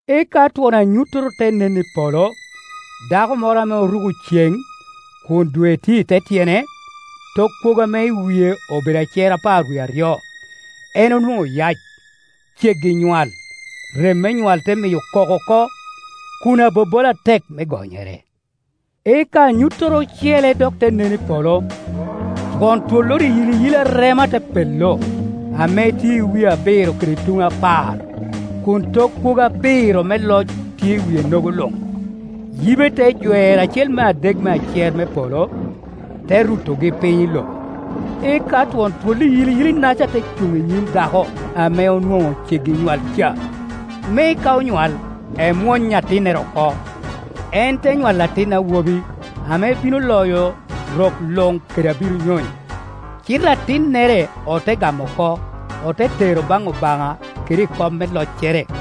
Eka twon anyuttoro te nen i polo, dako moro ame oruko ceŋ, kun dwe tye i te tyene, tok kwogo ame i wie obedo acer apar wie aryo. En onwoŋo yac, ceggi nywal; rem me nywal te miyo kok oko, kun abobola atek me gonyere. Eka anyuttoro ocele dok te nen i polo, Twon twolloro iyiliyili arema te pello, ame tye i wie abiro kede tuŋe apar, kun tok kwogo abiro me loc tye i wie-nogo luŋ. Yibe te jwero acel me adek me acer me polo, te rutogi piny i lobo. Eka twon twol iyiliyili-naca te cuŋ i nyim dako ame onwoŋo ceggi nywal ca, me ka onywal, emwony atinnere oko. En te nywalo atin awobi, ame bino loyo rok luŋ kede abiro nyonyo. Cite atinnere ote gamo oko, ote tero baŋ Obaŋa kede i kom me loccere.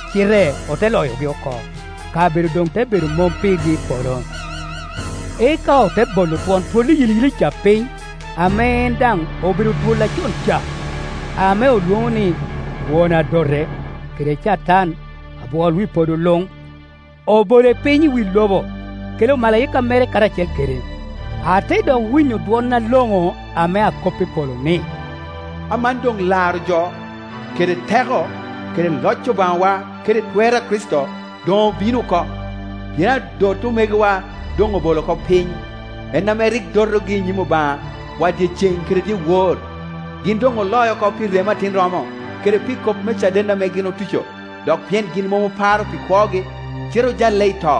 cite ote loyogi oko, kabedo doŋ te bedo mom pirgi i polo. Eka ote bolo twon twol iyiliyili ca piny, ame en daŋ obedo twol acon ca, ame olwoŋo ni Won Adote, kede Catan, abwol wi podo luŋ; obole piny i wi lobo, kede omalaika mere karacel kede. Ate dok winyo dwon aloŋo ame akop i polo ni, “Aman doŋ laro jo, kede teko, kede loc Obaŋawa kede twer a Kricito doŋ obino oko, pien adot omegowa doŋ obolo oko piny, en ame rik dotogi i nyim Obaŋawa dyeceŋ kede dyewor. Gin doŋ oloc oko pi remo Atin romo, kede pi kop me caden ame gin otuco, dok pien gin mom oparo pi kwogi, cite ojalle i to.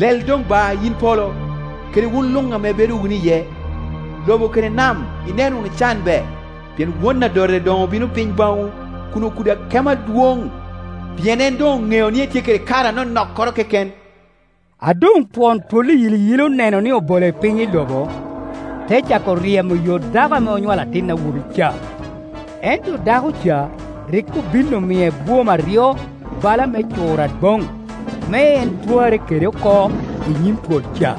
Lel doŋ ba, yin polo, kede wun luŋ ame ibedo wunu iye! Lobo kede nam ineno wunu can be, pien Won Adote doŋ obino piny baŋwu kun okudo akemo adwoŋ, pien en doŋ oneo ni etye kede kare anonokkoro keken!” A doŋ twon twol iyiliyili oneno ni obole piny i lobo, te cako ryemo yo dako ame onywalo atin awobi ca. Ento dako ca rik obin omie bwom aryo bala me cur adwoŋ, me en twarre kede oko i nyim twol ca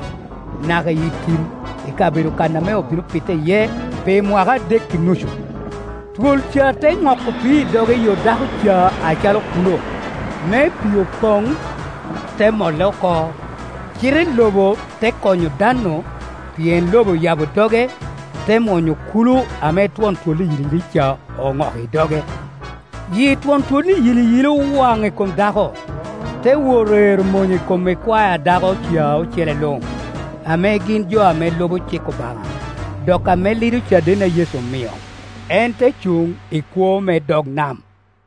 naka i tim, i kabedo kan ame obino pite iye pi mwaka adek i nucu. Twol ca te noko pii i doge i yo dako ca acalo kulo, me pii opoŋ, te mole oko. Cite lobo te konyo dan-nu, pien lobo oyabo doge, te mwonyo kula ame twon twol iyiliyili ca oŋoko i doge. Yi twon twol iyiliyili owaŋ i kom dako, te wot ero mony i kom ikwae a dako ca ocele luŋ, ame gin jo ame lubo cik Obaŋa, dok ame lido caden a Yecu omio. En te cuŋ i kwoo me dog nam.